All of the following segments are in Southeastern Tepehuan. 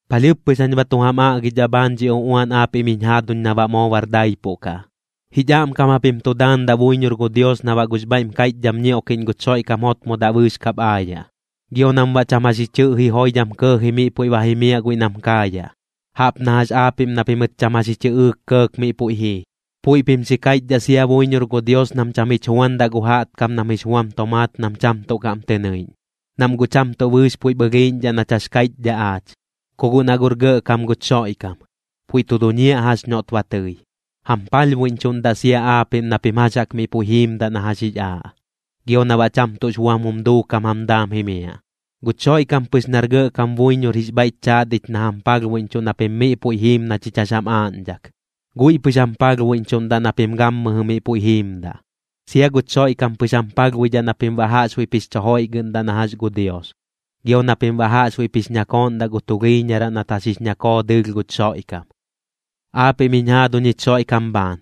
Palhɨɨp pɨx jañ ba tu jam aꞌgidhaꞌ bhaan dhi uꞌuan aapiꞌm jiñ jaaduñ na baꞌ moo bar daipuꞌ kaꞌ. Jich aꞌmkam japim tu daandaꞌ buiñor gu Dios na baꞌ gux bhaiꞌm kaiꞌchdham ñioꞌkiꞌñ guch Xoiꞌkam jotmodaꞌ bɨɨx kap aayaꞌ, gio nam baꞌ cham jax ji chɨꞌji joidham kɇɇji miꞌ puiꞌ ba jimiaꞌ guiꞌ nam kaayaꞌ, jaꞌp na jax aapiꞌm na pimɨt cham jax ji chɨꞌɨɨk kɇɇk miꞌ puiꞌ jii. Puiꞌ pim xi kaiꞌchdhaꞌ sia buiñor gu Dios nam cham jich juandaꞌ gu jaꞌtkam nam jix buam tomaat nam cham tuꞌ kaꞌm tɨ nɨiꞌñ, nam guꞌ cham tuꞌ bɨɨx puiꞌp ɨlhiiꞌñdhaꞌ nach jax kaiꞌchdhaꞌ aach. Ku guꞌ na guꞌr gɇꞌkam guch Xoiꞌkam, puiꞌ tu duñiaꞌ jax noꞌt ba tɨi. Jam palhbuiꞌñchuꞌndaꞌ sia aapiꞌm na pim jax jaꞌk miꞌ puiꞌ jiimdaꞌ na jax jix aaꞌ, gio na baꞌ cham tuꞌx buam jum duukam jam daam jimiaꞌ. Guch Xoiꞌkam pɨx nar Gɇꞌkam buiñor jix bhaiꞌch chaat ich na jam palhbuiꞌñchuꞌ na pim miꞌ puiꞌ jiim na chich jax jam aaꞌñdhak, guiꞌ pɨx jam palhbuiꞌñchuꞌndaꞌ na pim gammɨjɨ miꞌ puiꞌ jiimdaꞌ. Sia guch Xoiꞌkam pɨx jam palhbuidhaꞌ na pim baꞌ jaꞌxbuiꞌp jix chu joiꞌgɨꞌndaꞌ na jax gu Dios, gio na pim baꞌ jaꞌxbuiꞌp jix ñakooꞌndaꞌ gu tulhiiñaraꞌ nat jax jix ñakoo dɨɨlh guch Xoiꞌkam. Aapiꞌm jiñ jaaduñ jich Xoiꞌkam bhaan,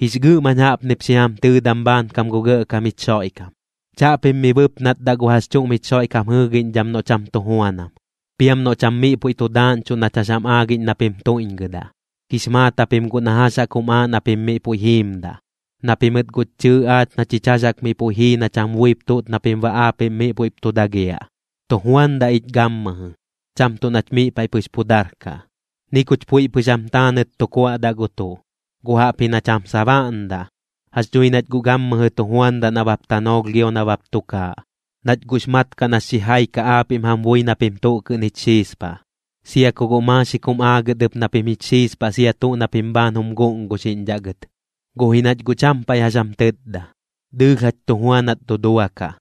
jix gɨꞌm jañ jaꞌpnip xi jam tɨɨdam bhaankam gu Gɇꞌkam jich Xoiꞌkam. Chaꞌpim mi bɨpnatdaꞌ gu jax chuꞌm jich Xoiꞌkam jɨɨgiꞌñdham noꞌ cham tu juanam, piam noꞌ cham miꞌ puiꞌ tu daaꞌñchuꞌ nach jax jam aagiꞌñ na pim tuiꞌñgɨdaꞌ. Jix maat japim guꞌ na jax jaꞌk jum aaꞌ na pim miꞌ puiꞌ jiimdaꞌ, na pimɨt guꞌch chɨɨ aach na chich jax jaꞌk miꞌ puiꞌ jii nach jam buip tuꞌt na pim baꞌ aapiꞌm miꞌ puiꞌp tu dagiaꞌ. Tu juandaꞌ ich gammɨjɨ, cham tuꞌ nach miꞌ paiꞌ pɨx pu darkaꞌ. Ni kuch puiꞌ pɨx jam taanɨt tu kuaꞌdaꞌ gu tuꞌ, guꞌ jaꞌpji nach jam sabaꞌndaꞌ. Jax dhui nach guꞌ gammɨjɨ tu juandaꞌ nabap tanoolh gio nabap tukaaꞌ, nach guꞌx mat kaꞌ nax xijai kaꞌ aapiꞌm jam bui na pim tuꞌ kɨꞌn jich xiispaꞌ. Sia ku guꞌ maaxik jum aagɨt ɨp na pim jich xiispaꞌ sia tuꞌ na pim bhaan jum guꞌnguxiꞌñdhaꞌ gɨt, guꞌ ji nach guꞌ cham paiꞌ jax jam tɨtda. Dɨɨlh jach tu juanat duduakaꞌ,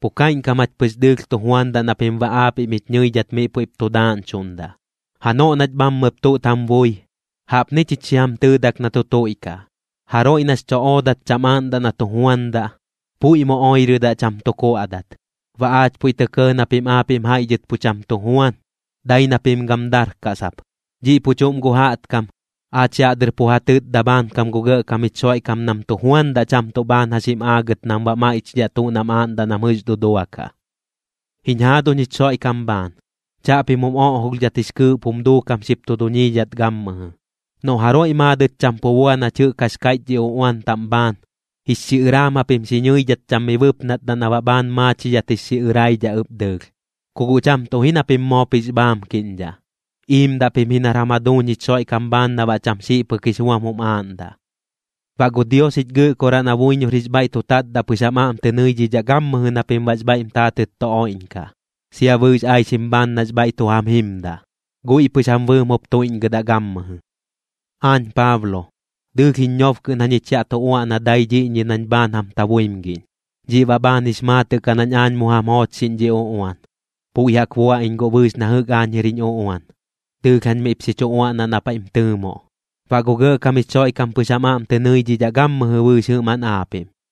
pu kaiꞌñkam jach pɨx dɨɨlh tu juandaꞌ na pim baꞌ aapiꞌm jich ñɨidhat miꞌ puiꞌp tu daaꞌñchuꞌndaꞌ. Janoꞌ nach bhammɨp tuꞌt jam bui, jaꞌpni chich xi jam tɨɨdak na tu tuiꞌkaꞌ: Jaroiꞌ nax cho oodat cham aaꞌndaꞌ na tu juandaꞌ, puiꞌ mu oirɨdaꞌ cham tu kuaꞌdat. Baꞌ aach puiꞌ tɇ kɇɇ na pim aapiꞌm jaiꞌ dhɨt pu cham tu juan, dai na pim gam darkaꞌ sap. Dhiꞌ pu chuꞌm gu jaꞌtkam, aach yaꞌ dɨr pu ja tɨtda bhaankam gu Gɇꞌkam jich Xoiꞌkam nam tu juandaꞌ cham tuꞌ bhaan jax jim aagɨt nam baꞌ maiꞌchidhaꞌ tuꞌ nam aaꞌndaꞌ nam jɨꞌx duduakaꞌ. Jiñ jaaduñ jich Xoiꞌkam bhaan, chaꞌpim jum oꞌjolhdhat jix kɨɨꞌp jum duukam xip tu duñiidhat gammɨjɨ. Noꞌ jaroiꞌ maadɨt cham pu bua nach jɨꞌk jax kaiꞌch dhi uꞌuan taꞌm bhaan, jix xiꞌɨraam japim xi ñɨidhat cham mi bɨpnatdaꞌ na baꞌ bhaan maachidhat jix xiꞌɨraidhaꞌ ɨp dɨɨlh. Ku guꞌ cham tuꞌ ji na pim moop jix bhaamkiꞌñdhaꞌ, iimdaꞌ pim ji nar jam jaduuñ jich Xoiꞌkam bhaan na baꞌ cham xiꞌ pɨk jix buam jum aaꞌndaꞌ. Baꞌ gu Dios jich Gɨꞌkoraꞌ na buiñor jix bhaiꞌ tu tatdaꞌ pɨx jam aꞌm tɨ nɨidhidhaꞌ gammɨjɨ na pim baꞌx bhaiꞌm taatɨt tu oiꞌñkaꞌ, sia bɨɨx aixim bhaan nax bhaiꞌ tu jam jimdaꞌ. Guiꞌ pɨx jam bɨɨm jup tuiꞌñgɨdaꞌ gammɨjɨ. Aañ Paablo, dɨɨlh jiñ ñob kɨꞌn jañich yaꞌ tu uaꞌna dai dhiꞌñi nañ bhaan jam tabuimgiꞌñ. Dhiꞌ baꞌ bhaan jix maatɨꞌ kaꞌ nañ aañ mu jam joochxiꞌñ dhi uꞌuan. Puiꞌ jaꞌk bua iñ guꞌ bɨɨx na jɨꞌk aañ jir jiñ uꞌuan, dɨɨlh jañ miꞌp xi chu uaꞌnaꞌ na paiꞌm tɨɨmoꞌ. Baꞌ gu Gɇꞌkam jich Xoiꞌkam pɨx jam aꞌm tɨ nɨidhidhaꞌ gammɨjɨ bɨɨx jɨꞌmaꞌn aapiꞌm.